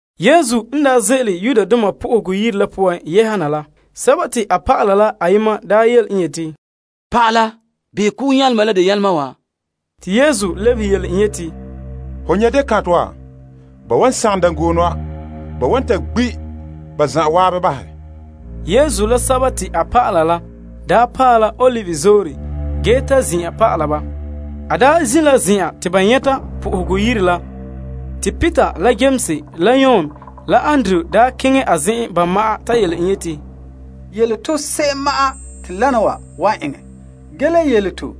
Yesu n daa ze'ele Yenɛ Yire la poan yɛha na la, a dɔlɔba la ayema daa yele en yeti, Pa'ala, behɛ kugu nyalema la deo nyalema wa! Yesu lebehe en yeti, Ho nyɛ' dekantɛ wa? Ba wan sagom dangoone wa. Ba wa ta gbi' ba zan'an bahɛ. Yesu n daa zin' la Olive Zoore la zen'en te ba nyɛta Yenɛ Yire la, te Peter la Yames la Yon la Andrew daa keŋɛ a zen'en ba ma'an ta yele en yeti, Yele to se'em ma'an te wana wa wan eŋɛ. Yele to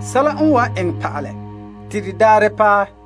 sɛla n wan eŋɛ pa'alɛ te de daarɛ n paɛ.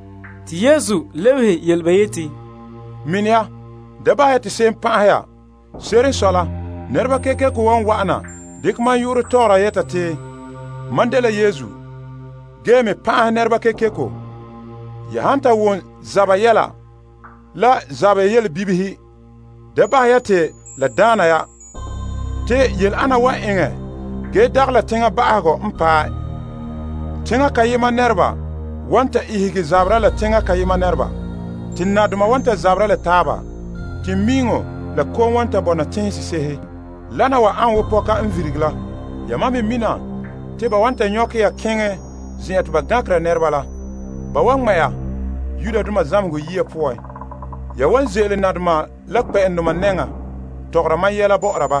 Yesu lebehe ba yeti, Mini ya, ge da bahɛ ya te se'em pan'ahɛ ya. Se'ere n sɔe la, nɛreba kekeko wan wa'ana dekɛ mam yu'urɛ tɔgɔra yɛta te, Mam dela Yesu, ge me pan'ahɛ nɛreba kekeko. Ya han ta wom zaba yɛla la zaba yelebibihe, da bahɛ ya te la daana ya. Te yele ana wan eŋɛ ge dagɛ la teŋa ba'ahegɔ n paɛ. Teŋa kayema nɛreba wan ta ihege zaberɛ la teŋa kayema nɛreba, te nadoma wan ta zabera la taaba. Teŋmiiŋɔ la kom wan bɔna teŋhe sese'ehe. Wana wa ane wo pɔka n virige la. Yamam me mina te ba wan ta nyɔkɛ ya keŋɛ zen'an te ba gankera nɛreba la. Ba wan ŋmɛ' ya zamehegɔ yiya poan. Ya wan ze'ele nadoma la kpɛ'ɛndoma nɛŋa tɔgɔra mam yɛla bɔ'ɔra ba.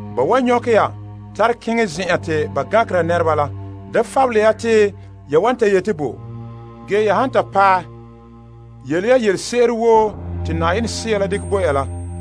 Ba han nyɔkɛ ya tare keŋɛ zen'an te ba gankera nɛreba la, da fabele ya te ya wan ta yeti bo. La han ta eŋɛ bala yele ya yelese'ere woo Yenɛ Sea la dekɛ bo ya la.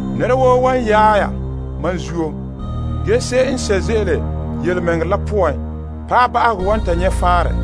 Nɛra woo wan yaɛ ya mam zuo, ge se'em n sɛ' ze'ele yelemɛŋɛrɛ la poan paɛ ba'ahegɔ wan ta nyɛ' faanrɛ.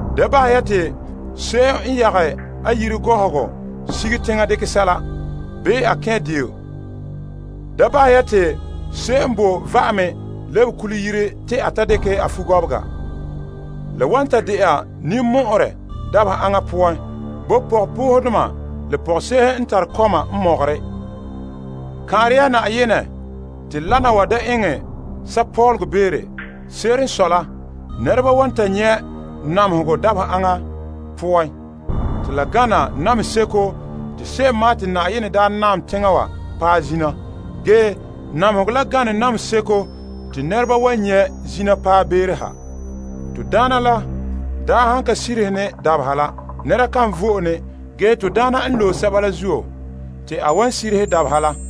Da bahɛ ya te se'em n yagɛ a yire gɔhɔgɔ sige teŋa dekɛ sɛla, bii a kɛn' deo. Da bahɛ ya te se'em n bo a va'ame lebe kule yire te a ta dekɛ a fugɔbega. La wan ta de'a ninmɔ'ɔrɛ dabeha aŋa poan bo pɔgɔpoohedoma la pɔgɔse'ehe n tare kɔma n mɔgɔrɛ! Kan'are ya Na'ayenɛ te wana wa da eŋɛ sapɔlɔgɔ beere. Se'ere n sɔe la, nɛreba wan ta nyɛ' namehegɔ dabeha aŋa poan te la gana namehe seko te se'em ma'an te Na'ayenɛ daa naam teŋa wa paɛ zina. Ge namehegɔ la gana namehe seko te nɛreba wan nyɛ' zina paɛ beere yɛ'ɛha. Te Na'ayenɛ la daa han ka sirihe ne dabeha la, nɛnɛra kan vo'e ne, ge sɛba te a loe la zuo, te a wan sirihe dabeha la.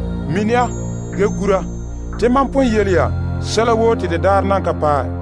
Mini ya, ge gura. Mam pon yele ya sɛla woo te de daarɛ nan ka paɛ.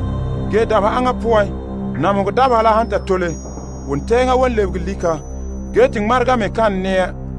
Ge dabeha aŋa poan, namehegɔ dabeha la han ta tole, wontɛɛŋa wan sobege, ge te ŋmarega bugum kan nɛɛ.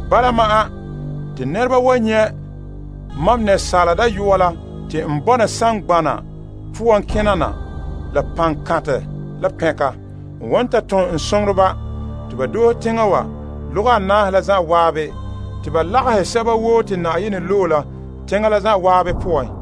Bala ma'an, te nɛreba wan nyɛ' Asaala Dayɔa la te a kena na saazuo saŋgbana wa poan la paŋkantɛ la pɛnka. A wan ta ton a soŋoreba te ba doohe teŋa lɔga anaahe la zan'an te ba lagahɛ sɛba woo te Na'ayenɛ loe la teŋa la zan'an poan.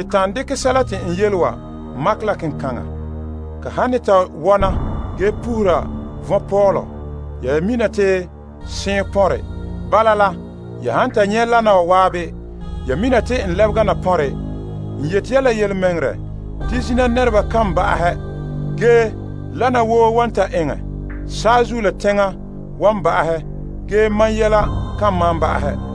Ta'an dekɛ sɛla te n yele wa makɛ la kenkaŋa. Ka han ne ta wɔna ge puhura vɔnpɔɔlɔ, ya mina te seɔn n pɔnre. Bala la, ya han ta nyɛ' wana wa zan'an, ya mina te n lebega na pɔnre. N yeti ya la yelemɛŋɛrɛ te zina nɛreba kan ba'ahɛ, ge te wana woo wan ta eŋɛ. Saazuo la teŋa wan ba'ahɛ, ge mam yelehom kan malom ba'ahɛ.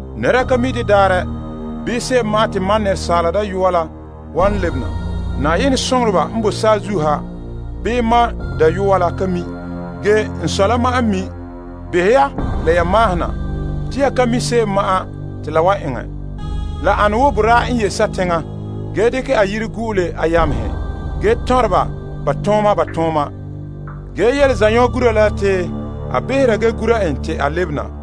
Nɛra ka mi' de daarɛ bii se'em ma'an te a wan lebena. Soŋoreba n boe saazuo ha bii Yenɛ dayɔa la ka mi'. A Sɔ' la ma'an n mi'. Behɛ ya la ya maahena! Te ya ka mi' se'em ma'an te la wan eŋɛ. La ane wo boraa n ye' sateŋa ge dekɛ a yire gu'ule a yamehe ge tɔnrɛ ba ba tooma, ba tooma. Ge a yele zanɔgura la te a behera gee gura en te a lebena.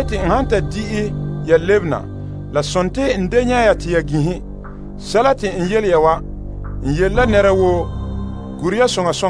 En han ta din'ɛ ya lebe na, la sontii a da nyɛ' ya te ya ginhe. Sɛla te n yele ya wa, n yele la nɛra woo. Gure ya!